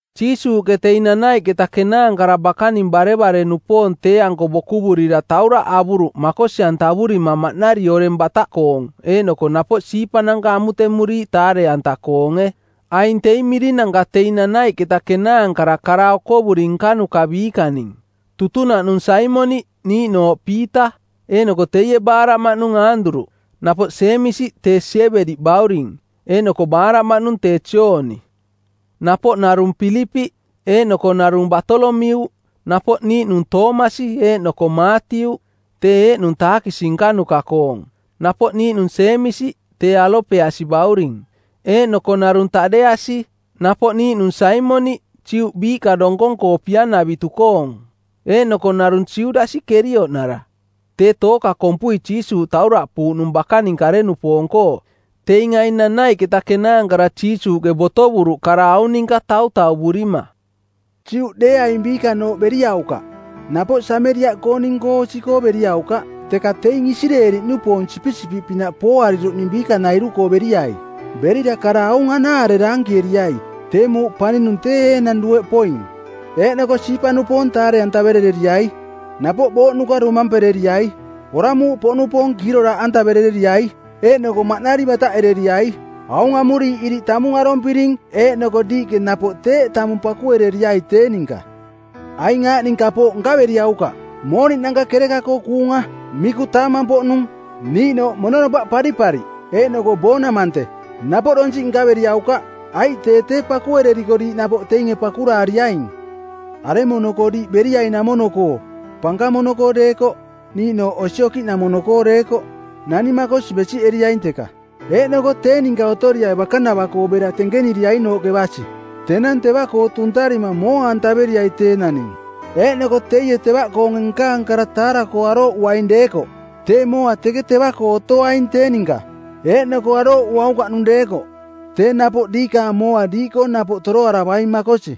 Jiisuuꞌke teing nanaiꞌketa kenaankara bakaning barevare-nupoong tee-anko bokuvurira tauraꞌ avuruꞌ makosi-antavurima maꞌnari oreng bataꞌkoong eeꞌnoko napoꞌ siipananka amutemuriiꞌ taare-anta-koonge. Aing teing mirinanka teing nanaiꞌketa kenaankara kara okovuri nkanuka biikaning: Tutunaꞌnung Saimoniꞌ, niiꞌnooꞌ Piita, eeꞌnoko teie baaraꞌmaꞌnung Aanduruꞌ; napoꞌ Jeemisi, tee Siebedi bauring; eeꞌnoko baaraꞌmaꞌnung tee Jooni. Napoꞌ narung Pilipiꞌ, eeꞌnoko narung Baatolomiuꞌ, napoꞌ niiꞌnung Toomasi eeꞌnoko Maatiuꞌ, tee eeꞌnung taakisi nkanuka-koong; napoꞌ niiꞌnung Jeemisi, tee Alopeasi bauring; eeꞌnoko narung Taꞌdeasi. Napoꞌ niiꞌnung Saimoniꞌ, Juꞌ biiꞌka donkong-koo pia-navitu-koong; eeꞌnoko narung Judasi Kerioꞌnara, tee tooka kompui Jiisuuꞌ tauraꞌpuuꞌnung bakaning kare-nupoong-koo. Teing aing nanaiꞌketa kenaankara Jiisuuꞌke botovuruꞌ kara aung ninka tautauvurima, “Juꞌdeeaing biikanooꞌ beriaukaꞌ, napoꞌ Sameriaꞌkooning-koo osi-koo beriaukaꞌ. Teka teing Isireeli-nupoong sipisipiꞌpinaꞌ pooariruꞌning biikanairu-koo beriai. Berira kara aung anaare daankieriai, ‘Tee muuꞌ paninung tee enang dueꞌ poing!’ Eeꞌnoko siipa-nupoong taare-antaverereriai. Napoꞌ booꞌnuka domampereriai. Oramuuꞌpoꞌnupoong kiiroraaꞌantaverereriai. Eeꞌnoko maꞌnari bataꞌereriai. Aung amuriiꞌ iriꞌ tamung arompiring eeꞌnoko diiꞌke napoꞌ teeꞌ tamung pakuereriai tee ninka. Aing aaꞌning kapooꞌnanka nkaveriaukaꞌ: mooniꞌnanka kereka-koo kuunga, miku taamang-poꞌnung, niiꞌnooꞌ mononopaꞌ paripariꞌ, eeꞌnoko boonamante˜, napoꞌ donsiꞌ nkaveriaukaꞌ, aiꞌ tee tee pakuereriko diiꞌ napoꞌ teinge pakuraariaing. Aremono-koo diiꞌ beriainamono-koo pankamono-koo deekoꞌ niiꞌnooꞌ osi okiꞌnamono-koo deekoꞌ naning makosi besiꞌeriaing teka, eeꞌnoko tee ninka otoriai bakanava-koo bera tenkeniriainooꞌke basi. Tenang teva-koo tuntarima mooa-antaveriai tee naning. Eeꞌnoko teie tevaꞌkoonge nkaang kara taara-koo arooꞌuaing deekoꞌ tee mooa teke teva-koo otoaing tee ninka, eeꞌnoko arooꞌuaukaꞌnung deekoꞌ tee napoꞌ diikaang mooa diiꞌkoo napoꞌ toroaravaing makosi.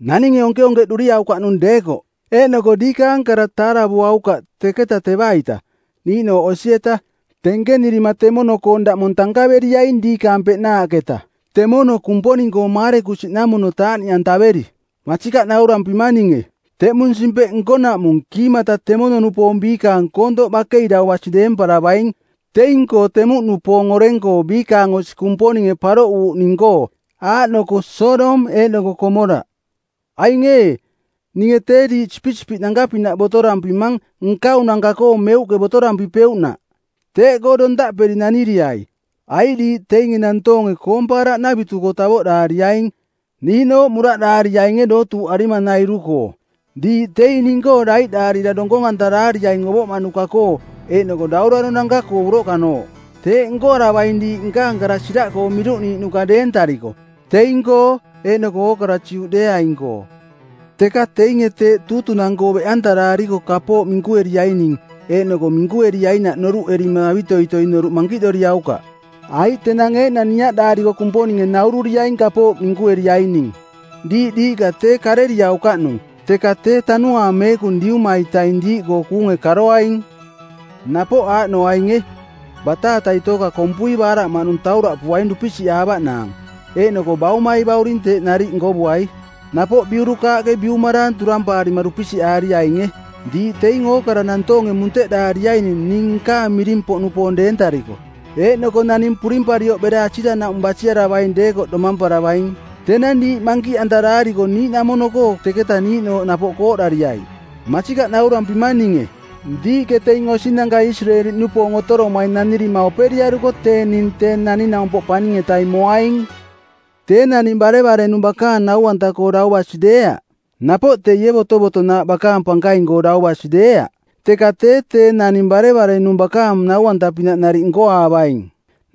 Naninge onkeonkeꞌduriaukaꞌnung deekoꞌ eeꞌnoko diikaang kara taaravuaukaꞌ teketa teva-ita, niiꞌnooꞌ osi-eta, tenkenirima temono-koong daꞌmong tankaveriaing diikaang peꞌnaaꞌketa temono Kumponing-koo maarekusiꞌnamono taaꞌniꞌantaveri. Masikaꞌ naurampimang ninge, teꞌmung simpeꞌ nkonaꞌmung kiimata temono-nupoong biikaang koontoꞌ bakei dau basi deemparavaing teing-koo temuꞌnupoong oreng-koo biikaang osi Kumponinge paroꞌuuꞌning-koo, aaꞌnoko Sodom eeꞌnoko Komoraꞌ.” “Aing ee, ninge tee diiꞌ sipisipiꞌnanka-pinaꞌ botorampimang nkaunanka-koo meuꞌke botorampipeuꞌnaꞌ. Teeꞌkoo dontaꞌperi naniriai, aiꞌ diiꞌ teinge nantoonge koompaaraꞌnavitu-koo tavoꞌdaariaing, niiꞌnooꞌ muraꞌdaariainge dootuuꞌarimanairu-koo. Diiꞌ teing ning-koo daiꞌdaarira donkong-antaraariaing ovoꞌmaꞌnuka-koo eeꞌnoko dauraronanka-koo uroꞌkanooꞌ. Teeꞌ nkoaravaing diiꞌ nkaang kara siraꞌkoo miruꞌniiꞌnuka deentariko, teing-koo eeꞌnoko ookara Juꞌdeeaing-koo. Teka teinge teeꞌ tuutunang˜koo beꞌantaraariko kapooꞌ minkueriaining eeꞌnoko minkueriainaꞌ noruꞌerima avitoitoi noruꞌ mankiꞌdoriaukaꞌ. Aiꞌ tenang eeꞌnang niaꞌdaariko Kumponinge naururiaing kapooꞌ minkueriaining. Diiꞌ diiꞌka tee kareriaukaꞌnung, teka tee Tanuaang Meekung Diuma-itaing diiꞌkoo kuunge karoaing. “Napoꞌ aaꞌnoainge: bataatai tooka kompui baaraꞌmaꞌnung tauraꞌpuaing dupisiꞌaavaꞌnaang, eeꞌnoko baumai bauring teeꞌ nariꞌ nkovuai. Napoꞌ biurukaaꞌke biumaraang turampaarima dupisiꞌaari-ainge. Diiꞌ teing ookara nantoonge munteꞌdaariaining ning nkaang miring-poꞌnupoong deentariko, eeꞌnoko naning purimparioꞌ bera asiranaꞌmung basiaravaing deekoꞌ domamparavaing. Tenang diiꞌ mankiꞌantaraariko niiꞌnamono-koo teketa niiꞌnooꞌ napoꞌ kooꞌdariai. Masikaꞌ naurampimang ninge, diiꞌke teing osinanka Isireeli-nupoong otoromaing nanirima operiaruko tee ning Tee Naning-naumpoꞌ Paning-etaing moaing. “Tee naning barevare-nung bakaang nau-anta-koo dau basi deeaꞌ. Napoꞌ teie botovotonaaꞌ bakaang pankaing-koo dau basi deeaꞌ. Teka tee tee naning barevare-nung bakaang nau-anta-pinaꞌ nariꞌ nkoaavaing.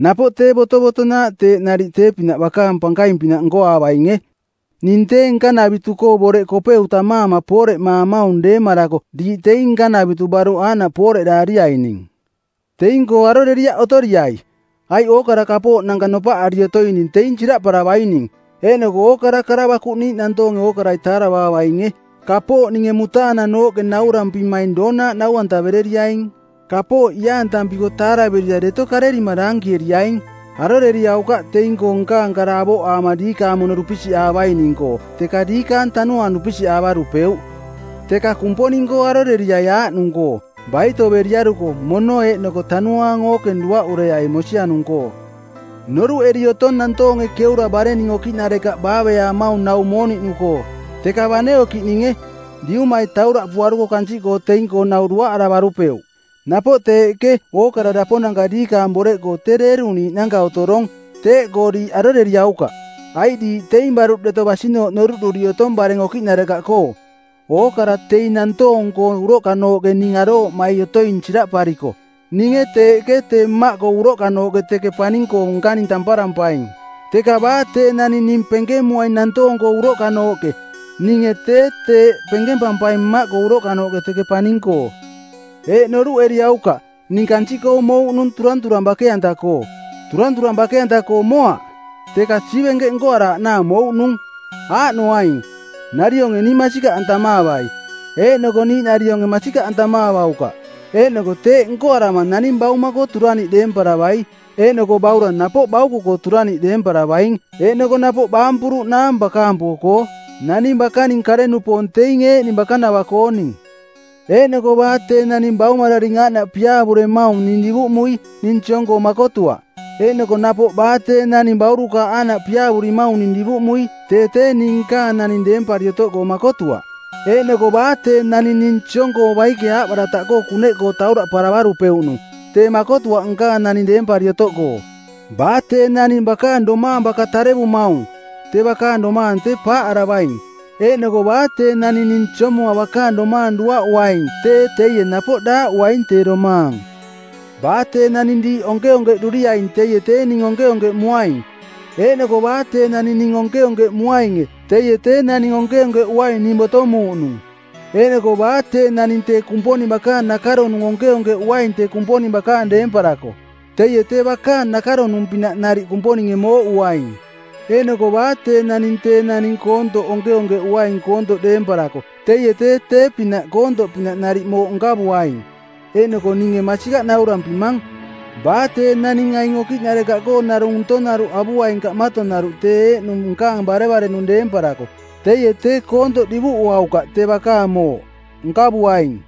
Napoꞌ tee botovotonaaꞌ teeꞌ nariꞌ tee-pinaꞌ bakaang pankaing-pinaꞌ nkoaavainge. Ning tee nkanavitu-koo boreꞌ Kopeu tammaama pooreꞌmaamaung deemarako diiꞌ teing nkanavitu baruꞌ aaꞌnooꞌ pooreꞌdaariaining. Teing-koo aroreriaꞌ otoriai, aiꞌ ookara kapooꞌnanka nopaꞌari otoining teing siraꞌparavaining. Eeꞌnoko ookara kara bakuꞌniiꞌ nantoonge ookarai taaravaavainge. Kapooꞌ ninge mutaananooꞌke naurampimaing doonaaꞌ nau-antavereriaing. Kapooꞌ iaantampiko taaraverira deto karerima daankieriaing.” “Aroreriaukaꞌ teing-koo nkaang kara avoꞌaama diikaang mono dupisiꞌaavaining-koo teka diikaang tanuaang dupisiꞌaavarupeuꞌ. Teka Kumponing-koo aroreriai aaꞌnung-koo: baitoveriaruko mono eeꞌnoko tanuaang ookeng duaꞌureai mosianung-koo. “Noruꞌeri otong nantoonge keura barenning okiꞌnarekaꞌ baaveaamaung nau mooniꞌnu-koo, teka bane okiꞌninge, Diumai tauraꞌpuaruko kansiꞌkoo teing-koo nau duaꞌaravarupeuꞌ. Napoꞌ teeꞌke ookara daponanka diikaang boreꞌkoo tee deeruniiꞌnanka otorong. Teeꞌkoo diiꞌ aroreriaukaꞌ, aiꞌ diiꞌ teing baruꞌ deto basinooꞌ noruꞌduri otong bareng okiꞌnarekaꞌkoo. Ookara teing nantoong-koo uroꞌkanooꞌke ning arooꞌmai otoing siraꞌpariko ninge teeꞌke tee Mmaꞌkoo uroꞌkanooꞌke teke paning-koo nkaning tamparampaing. Teka baa tee naning ning penkemuaing nantoong-koo uroꞌkanooꞌke ninge tee teeꞌ penkempampaing Mmaꞌkoo uroꞌkanooꞌke teke paning-koo.” “Eeꞌ noruꞌeriaukaꞌ ning kansiꞌkoo mouꞌnung turanturang bake-anta-koo. Turanturang bake-anta-koo moaꞌ, teka siivenkeꞌ nkoaraaꞌnaang mouꞌnung. Aaꞌnoaing, narionge ning masikaꞌantamaavai eeꞌnoko niiꞌnarionge masikaꞌantamaavaukaꞌ. Eeꞌnoko teeꞌ nkoarama naning bauma-koo turaniꞌ deemparavai eeꞌnoko baurang napoꞌ bauko-koo turaniꞌ deempaaravaing, eeꞌnoko napoꞌ baampuruꞌnaang bakaampo-koo. Naning bakaning kare-nupoong teing eeꞌning bakanava-kooning. Eeꞌnoko baa tee naning baumararing aaꞌnaꞌ piaavuremaung ning divuꞌmui ning siong-koo makotuaꞌ. Eeꞌnoko napoꞌ baa tee naning baurukaaꞌ aaꞌnaꞌ piaavurimaung ning divuꞌmui tee tee ning nkaang naning deempari otoꞌkoo makotuaꞌ. Eeꞌnoko baa tee naning ning siong-koo baike aaꞌbarataꞌkoo˜ kuneꞌkoo tauraꞌparavarupeuꞌnung tee makotuaꞌ nkaang naning deempari otoꞌkoo. Baa tee naning bakaang domaang baka tarearamaung tee bakaang domaang tee paaꞌaravaing, eeꞌnoko baa tee naning ning siomuma bakaang domaang duaꞌuaing tee teie napoꞌ daaꞌuaing tee domaang. “Baa tee naning diiꞌ onkeonkeꞌduriaing teie tee ning onkeonkeꞌmuaing, eeꞌnoko baa tee naning ning onkeonkeꞌmuainge teie tee Naning onkeonkeꞌuaing ning botomuuꞌnung. Eeꞌnoko baa tee naning tee Kumponing bakaang nakaronung onkeonkeꞌuaing tee Kumponing bakaang deemparako teie tee bakaang nakaronung-pinaꞌ nariꞌ Kumponinge mooꞌuaing. Eeꞌnoko baa tee naning tee naning koontoꞌ onkeonkeꞌuaing koontoꞌ deemparako, teie tee tee-pinaꞌ koontoꞌpinaꞌ nariꞌ mooꞌ nkavuaing. Eeꞌnoko ninge masikaꞌ naurampimang, baa tee naning aing okiꞌnarekaꞌkoo narung ntonaruꞌ avuaing kaꞌmatonaruꞌ tee eeꞌnung nkaang barevare-nung deemparako teie tee koontoꞌ divuꞌuaukaꞌ tee bakaang mooꞌ; nkavuaing.”